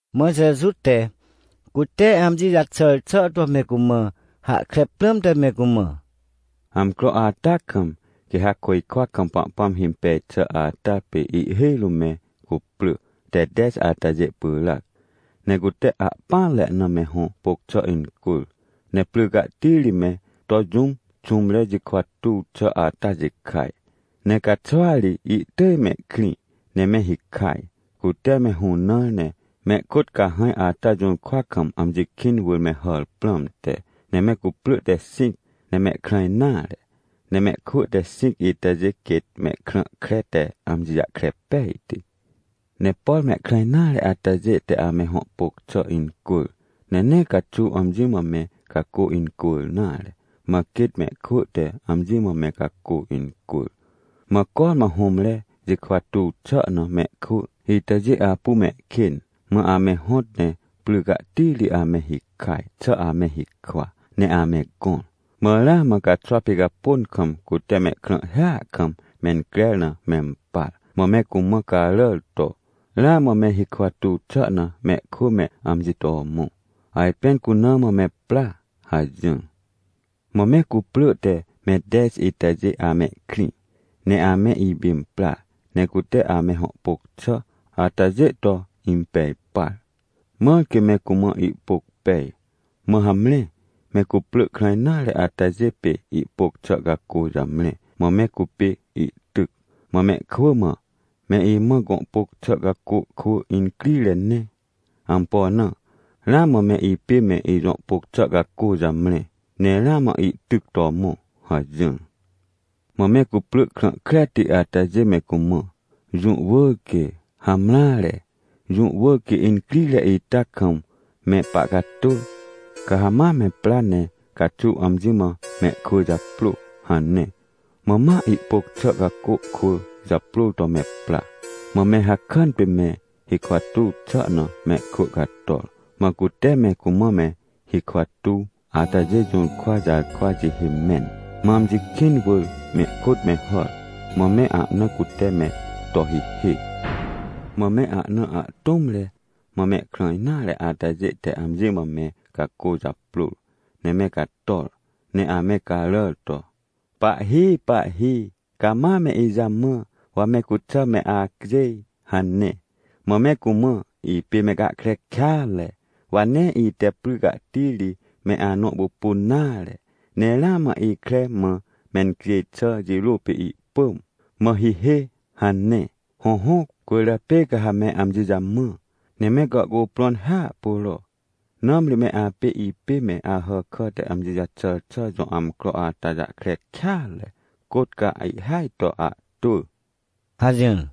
Mã Jeju te, cute amji jaxàr xà to me cumã hahkre prãmte me cumã: — Amcro ata kam, quê ha côjkwa kam Pahpãm himpej xà ata pê ihhêj rũm me cuprỳ te tej atajê pyràc. Ne cute ahpỹanre na me hõ pôc xà incwỳr, ne pry cahti ri me to jũm xũmre jikwa tuw xà ata jikaj. Ne caxwa ri ihtỳj mehkrĩ ne me hikaj, cute me hũnãr ne mehkôt cahãj ata jũrkwa kam amji kĩn wỳr me hàr prãmte. — Ne me cuprỳ te xĩc ne mehkrã nare, ne mehkwỳ te xĩc itajê quêt mehkrã kre te amji jahkre pejti. Ne por mehkrã nare atajê te ame hõ pôc xà incwỳr, ne nee caxuw amji mã me cacô incwỳr nare. Mã quêt mehkwỳ te amji mã me cacô incwỳr. Mã cormã hũmre jikwa tuw xà na mehkwỳ itajê apu mehkên, mã ame hõt ne pry cahti ri ame hikaj xà ame hikwa ne ame gõr. — Mã ramã caxwa picapôn kam, cute mehkrãhhia kam mencrer na mempar. Mã me cumã caràr to: “Ramã me hikwa tuw xà na mehkwỳ me amji to mõ! Ajpên cuna mã me pra!” hajỹr. — Mã me cuprỳ te me tej itajê amehkrĩ, ne ame ipimprar, ne cute ame hõ pôc xà atajê to impej par, mãr quê me cumã ihpôc pej. Mã hamre me cuprỳ krã nare atajê pê ihpôc xà cacô jamre, mã me cupê ihtyc, mã mehkwỳ mã: “Me imã gõ pôc xà cacô kwỳ incrire ne. Ampo na? Ramã me ipê me ijõ pôc xà cacô jamre, ne ramã ihtyc to mõ” hajỹr. — Mã me cuprỳ krã kreti atajê me cumã: “Jũ wỳr quê. Hamreare, jũ wỳr quê incrire ita kam me pahcatwỳ. Ca ha ma me pra ne caxuw amji mã mehkwỳ japrô” hane. — Mã ma ihpôc xà cacô kwỳ japrôr to me pra, mã me hakàn pê me hikwa tuw xà na mehkwỳ cator. Mã cute me cumã me hikwa tuw atajê jũrkwa jarkwa jihê mẽn, mã amji kĩn wỳr mehkôt me hàr. Mã me ahna cute me to hihê. — Mã me ahna ahtũmre, mã mehkrã nare atajê te amji mã me cacô japrôr, ne me cator, ne ame caràr to: “Pahhi, pahhi, cama me ijamã, wa me cuxà me acjêj!” hane. — Mã me cumã: “Ipê me gahkre kêatre, wa nee ite pry cahti ri me anõ pupun nare. Ne ramã ikre mã mencjêj xà jirô pê ihpỳm, mã hihê” hane. — Hõhõ, cwỳrjapê ca ha me amji jamã, ne me gàhcuprõn hiahpuro, nãmri me apê ipê me Ahàkà te amji jaxàr xà jõ amcro ata jahkre kêatre, côt ca ihhêaj to ahtwỳ — hajỹr.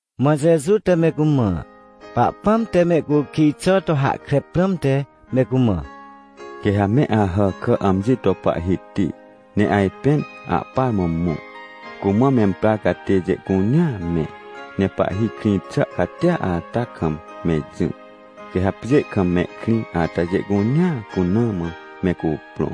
Mã Jeju te me cumã Pahpãm te mehcukij xà to hahkre prãmte me cumã: — Quê ha me Ahàkà amji to Pahhiti, ne ajpên ahpar mã mõ, cumã memprar catêjê cunea me, ne pahhi krĩ xà catia ata kam me jỹ. Quê ha pjê kam mehkrĩ atajê cunea cuna mã me cuprõ,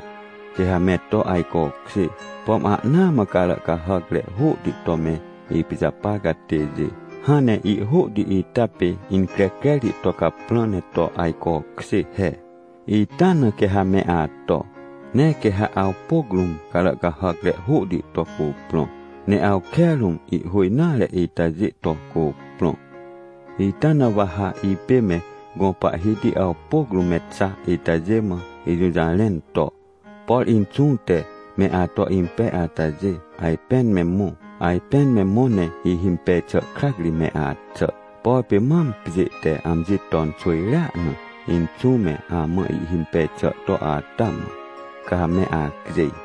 quê ha me to ajcokjê. Pom ahnaa mã carà cahàcre hôhti to me ipijapar catêjê, hãn ne ihhôhti ita pê, increcrerti to caprã ne to ajcokjê he, ita na quê ha me ato. Ne quê ha awpôc rũm carà cahàcre hôhti to cuprõ, ne awke rũm ihhô nare itajê to cuprõ. — Ita na wa ha ipê me gõ Pahhiti awpôc rũm me xa itajê mã ijũjarẽn to: “Por Inxũ te me ato impej atajê, ajpên me mõ. Ajpên me mõ ne ihhimpej xà krac ri me axà. Por pê mam pjê te amji ton xwỳjrea na, Inxũ me amã ihhimpej xà to ata mã, ca me acjêj.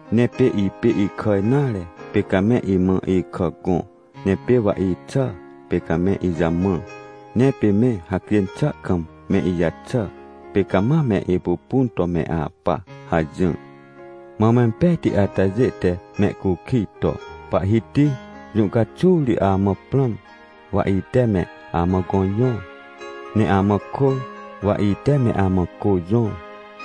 Ne pê ipê ikà nare, pê ca me imã ikà gõ. Ne pê wa ixà, pê ca me ijamã. Ne pê me hacjên xà kam me ijaxà, pê ca ma me ipupun to me apa” hajỹr. — Mã mempejti atajê te mehcukij to: “Pahhiti, jũ caxuw ri amã prãm, wa ite me amã gõ jõr? Ne amã kôr, wa ite me amã cô jõr?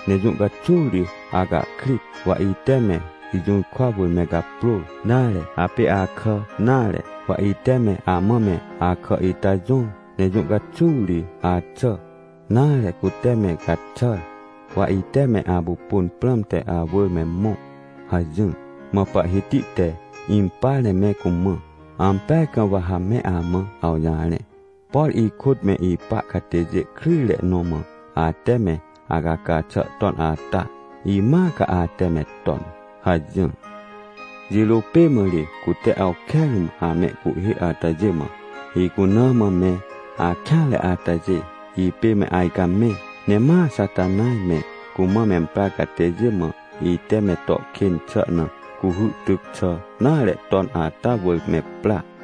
Ne jũ caxuw ri acahkrit, wa ite me ijũrkwa wỳr me gaprôr? Nare, apê akà nare, wa ite me amã me akà ita jõr? Ne jũ caxuw ri axà, nare, cute me gaxàr, wa ite me apupun prãmte awỳr me mõ?” hajỹr. Mã Pahhiti te impar ne me cumã: “Ampeaj kam wa ha me amã awjarẽ, por ikôt me ipa catêjê kryjre nõ mã ate me acaca xà ton ata, imãa ca ate me ton” hajỹr. — Jirô pê mã ri cute awke rũm amehcuhhê atajê mã: “Icuna mã me akêanre atajê, ipê me ajcamẽ. Ne ma Xatanaj me, cumã memprar catêjê mã, ite me to kên xà na cuhy tyc xà nare ton ata wỳr me pra.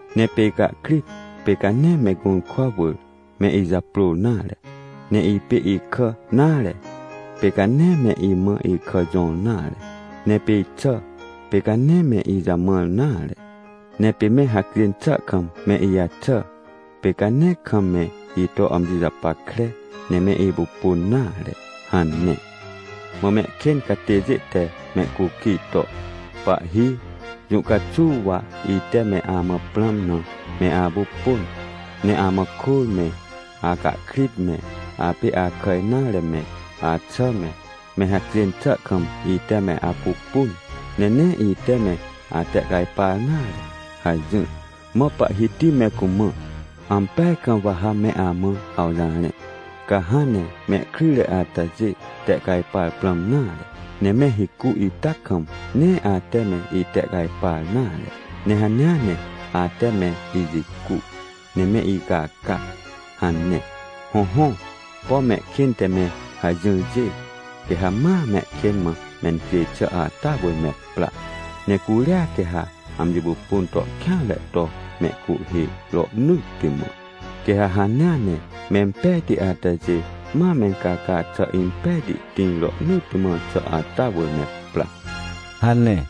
Ne pê icahkrit, pê ca nee me gũrkwa wỳr, me ijaprôr nare, ne ipê ikà nare, pê ca nee me imã ikà jõr nare. Ne pê ixà, pê ca nee me ijamãr nare, ne pê me hacjên xà kam me ijaxà, pê ca nee kam me ito amji japackre ne me ipupun nare” hane. — Mã mehkên catêjê te mehcukij to: “Pahhi, jũ caxuw wa ite me amã prãm na me apupun, ne amã kôr me, acahkrit me, apê akà nare me, axà me, me hacjên xà kam ite me apupun, ne nee ite me atehcajpar nare?” hajỹr. — Mã Pahhiti me cumã: “Ampeaj kam wa ha me amã awjarẽ, ca hãn ne mehkryjre atajê tehcajpar prãm nare, ne me hicu ita kam, nee ate me itehcajpar nare, ne hanea ne ate me ijicu, ne me icaca” hane. — Hõhõ, pom mehkên te me hajỹrjê, quê ha ma mehkên mã mencjêj xà ata wỳr me pra, ne curia quê ha amji pupun to kêanre to mehcuhhê rohnỳtti mã. Quê ha hanea ne, mempejti atajê ma mencaca xà impejti tĩr rohnỳtti mã xà ata wỳr me pra — hane.